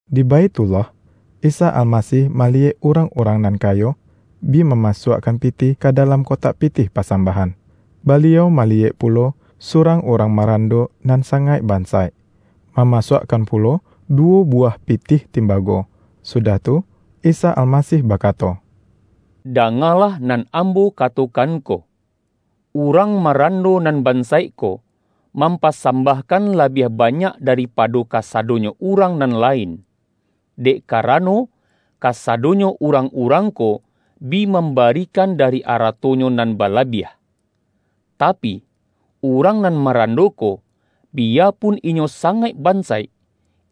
Di Baithullah, Isa Almasih ma-liyek urang-urang nan kayo bi mamasuakkan pitih ka dalam kotak pi-tih pasambahan. Baliau maliyek pu-lo, surang urang marando nan sangaik bansaik, mamasuakkan pulo duwo buwah pitih timbago. Sudah tu, Isa Almasih bakato,”Dangalah nan Ambo katokan ko: urang marando nan ban-saik ko, mampasambahkan labiah banyak daripado kasadonyo urang nan lain. Dek karano, kasadonyo urang-urang ko, bi mambarikan dari aratonyo nan balabiah. Tapi, urang nan maran-do ko, biyapun inyo sangaik bansaik,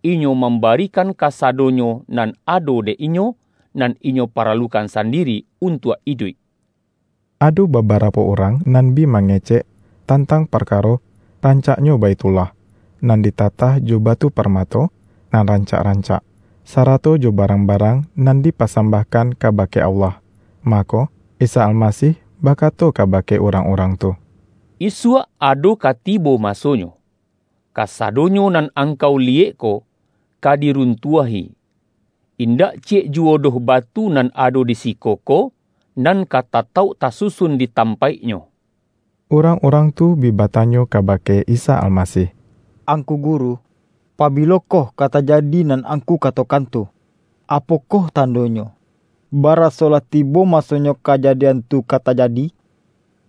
inyo mambarikan kasadonyo nan ado dek inyo, nan inyo paralukan sandiri untuak iduik.” Ado babarapo urang nan bi ma-ngecek tantang parkaro rancaknyo Baithullah, nan ditatah jo batu par-mato nan rancak-rancak, sarato jo ba-rang-barang nan dipasambahkan ka-bake Allah. Mako, Isa Almasih bakato kabake urang-urang tu, ”Isuak ado ka tibo masonyo, kasadonyo nan angkau liyek ko, ka diruntuahi; indak ciyek juwo doh batu nan ado di siko ko, nan ka tatauk tasusun di tampaiknyo!” Urang-urang tu bi batanyo kabake Isa Almasih,”Angku Guru, pabilokoh ka tajadi nan Angku katokan tu? Apo-koh tandonyo, baraso lah tibo maso-nyo kajadian tu ka tajadi?”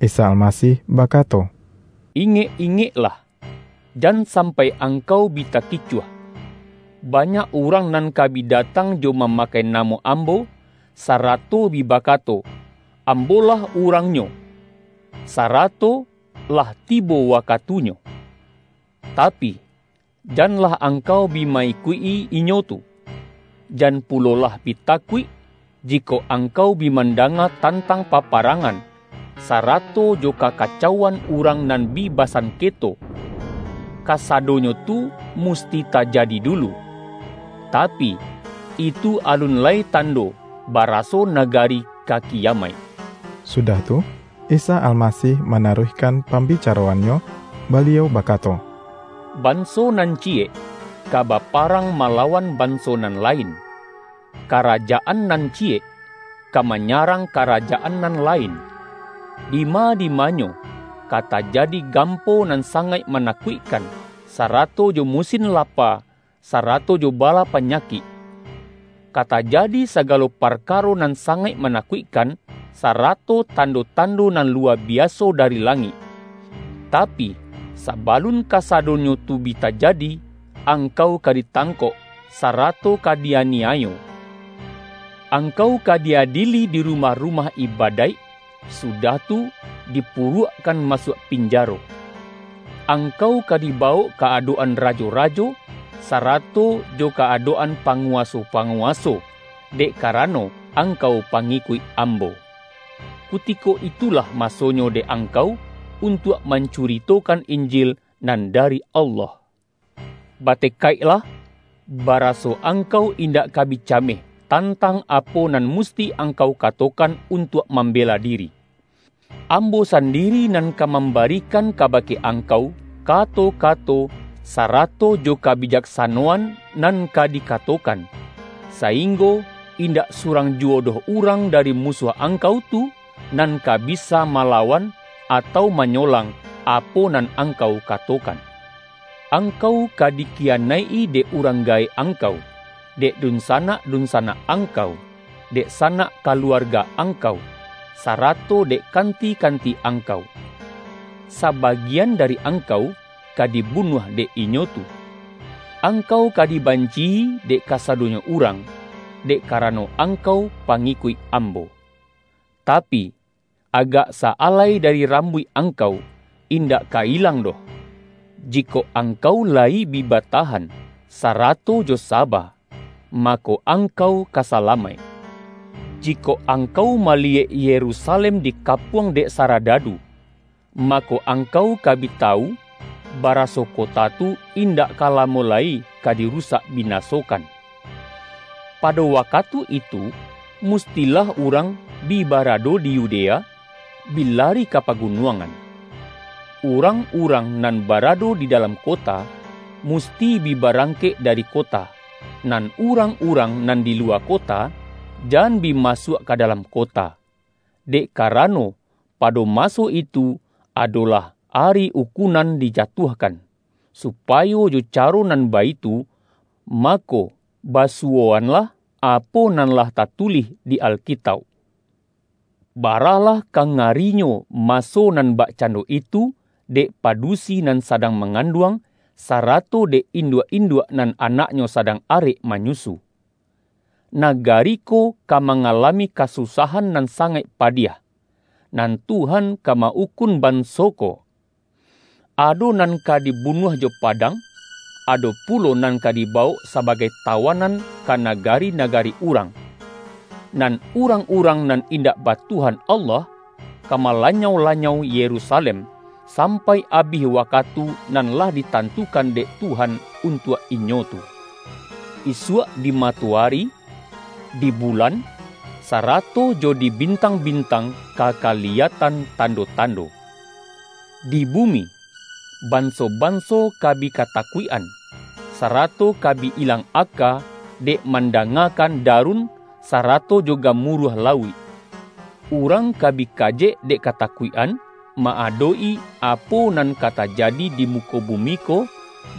Isa Almasih bakato,”Ingek-ingek-lah, jan sampai angkau bi takicuah. Banyak urang nan ka bi datang jo ma-makai namo Ambo, sarato bi bakato, Ambo-lah Urang-Nyo!' sarato, ’Lah tibo wakatunyo.’ Tapi, janlah angkau bi ma-ikuik-i inyo tu. Jan pulolah bi takuik, jikok angkau bi mandanga tantang paparangan, sarato jo kaka-cauan urang nan bi basanketo. Kasa-donyo tu musti tajadi dulu. Tapi, itu alun lai tando, baraso nagari ka ki-yamaik.” Sudah tu, Isa Almasih manaruih-kan pambicaroan-Nyo, Baliau bakato,”Banso nan ciyek ka baparang mala-wan banso nan lain, karajaan nan ci-yek ka manyarang karajaan nan lain. Dima-dimanyo ka tajadi gampo nan sangaik manakuikkan, sarato jo musin lapa sarato jo bala panyakik. Ka tajadi sagalo parkaro nan sangaik manakuikkan, sarato tando-tando nan luwa biaso dari langik. Tapi, saba-lun kasadonyo tu bi tajadi, angkau ka ditangkok, sarato ka di-aniayo. Ang-kau ka di-adieli di rumah-rumah iba-daik, sudah tu, dipuruakkan masuak pinjaro. Angkau ka dibawok ka adok-an rajo-rajo, sarato jo ka adok-an pa-nguwaso-panguwaso, dek karano ang-kau pangikuik Ambo. Kutiko itulah masonyo dek angkau, untuak mancu-ritokan Injil nan dari Allah. Bate-kaiklah, baraso angkau indak ka bi cameh, tantang apo nan musti ang-kau katokan untuak mambela diri. Ambo sandiri nan ka mambarikan kabake angkau, kato-kato sarato jo ka-bijaksanoan nan ka dikatokan, saing-go indak surang juwo doh urang dari musuah angkau tu, nan ka bisa ma-lawan atau manyolang, apo nan ang-kau katokan. Angkau ka dikiyanaik-i dek urang gaek angkau, dek dunsa-nak-dunsanak angkau, dek sanak ka-luarga angkau, sarato dek kanti-kanti angkau. Sabagian dari angkau, ka di-bunuah dek inyo tu. Angkau ka di-banci-i dek kasadonyo urang, dek ka-rano angkau pangikuik Ambo. Tapi, agak sa-alai dari rambuik angkau, in-dak ka ilang doh. Jikok angkau la-yi bi batahan, sarato jo saba, mako, angkau ka salamaik.” ”Jikok angkau maliyek Yerusalem dikapuang dek saradadu, mako, angkau ka bi tawu, baraso kota tu indak ka la-mo lai ka dirusak binasokan. Pado wakatu itu, mustilah urang bi bara-do di Yudea, bi lari ka pagunuangan. Urang-urang nan barado di dalam ko-ta, musti bi barangkek dari kota, nan urang-urang nan di luwa kota, jan bi masuak ka dalam kota. Dek kara-no, pado maso itu, adolah ’Ari Ukun-an Dijatuahkan’, supayo jo caro nan baitu, mako basuwoanlah apo nan lah tatulih di Alkitauk. Baralah ka nga-rinyo, maso nan bakcando itu dek pa-dusi nan sadang manganduang, sara-to dek induak-induak nan anaknyo sadang arek manyusu! Nagari ko ka mangalami kasusahan nan sangaik padiah, nan Tuhan ka ma-ukun ban-so ko. Ado nan ka dibunuah jo pa-dang, ado pulo nan ka dibawok saba-gai tawanan ka nagari-nagari urang; nan urang-urang nan indak ba Tuhan Allah, ka malanyau-lanyau Yerusalem, sampai abih wakatu nan lah ditantu-kan dek Tuhan untuak inyo tu.” ”Isuak di matoari, di bulan, sara-to jo di bintang-bintang ka kaliyatan tando-tando. Di bumi, banso-banso ka bi katakuik-an, sarato ka bi ilang aka, dek mandangakan darun, sara-to jo gamuruah lauik. Urang ka bi kajek dek katakuik-an, ma-adok-i apo nan ka tajadi di muko bumi ko,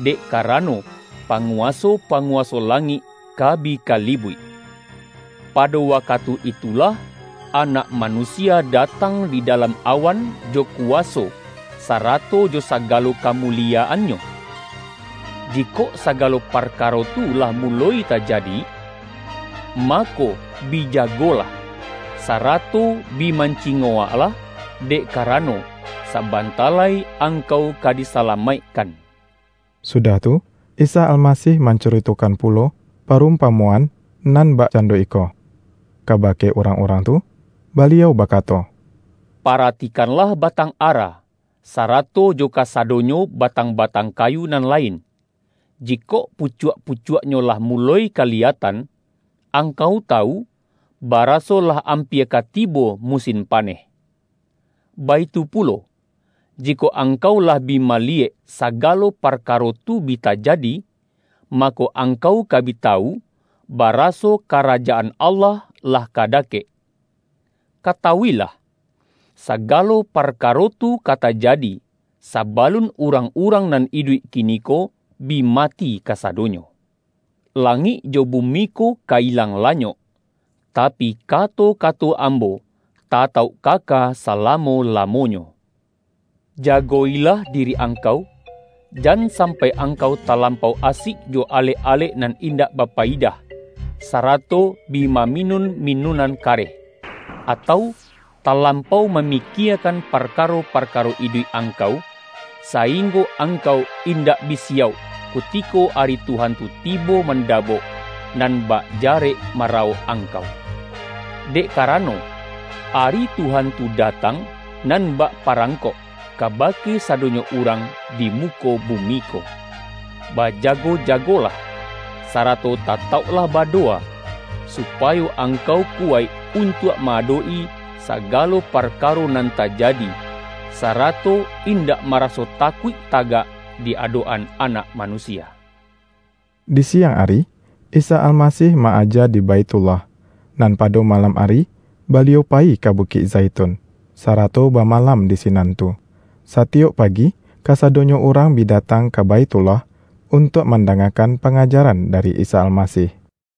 dek karano, panguwaso-panguwaso la-ngik ka bi kalibuik. Pado wakatu itulah, Anak Manusia datang di da-lam awan, jo kuwaso, sarato jo saga-lo kamuliyaan-Nyo. Jikok sagalo parkaro tu lah muloi tajadi, mako, bi jagolah, sarato bi mancingowaklah, dek karano, sabanta lai angkau ka di-salamaikkan.” Sudah tu, Isa Almasih mancurito-kan pulo parumpamoan nan bakcan-do iko, kabake urang-urang tu, Baliau bakato,”Paratikanlah batang ara, sa-rato jo kasadonyo batang-batang kayu nan lain. Jikok pucuak-pucuaknyo lah muloi kaliyatan, angkau tawu, ba-raso lah ampia ka tibo musin paneh. Baitu pulo, jikok angkau lah bi maliyek, sagalo parkaro tu bi tajadi, ma-ko, angkau ka bi tawu, baraso Kara-jaan Allah lah ka dakek. Katawu-ilah! Sagalo parkaro tu ka tajadi, sabalun urang-urang nan iduik kiniko bi mati kasadonyo. Langik jo bumi ko ka ilang lanyok, tapi, kato-kato Ambo tatauk kaka salamo-lamonyo.” ”Jago-ilah diri angkau, jan sampai angkau talampau asik jo alek-alek nan indak bapayidah, sarato bi maminun minunan kareh, atau talampau mami-kiekan parkaro-parkaro iduik angkau, sainggo angkau indak bi siyauk, kuti-ko Ari Tuhan tu tibo mandabok, nan bak jarek marawok angkau. Dek ka-rano, Ari Tuhan tu datang nan bak pa-rangkok, kabake sadonyo urang di mu-ko bumi ko. Bajago-jagolah, sarato tatauklah badowa, supayo angkau ku-waik untuak ma-adok-i sagalo parkaro nan tajadi, sarato indak maraso takuik tagak di adok-an Anak Manusia.” Di siang ari, Isa Almasih ma-aja di Baithullah, nan pado malam ari Baliau payi ka Bukik Zaitun, sarato ba-malam di sinan tu. Satiyok pagi, ka-sadonyo urang bi datang ka Baithullah, untuak mandangakan pangajaran da-ri Isa Almasih.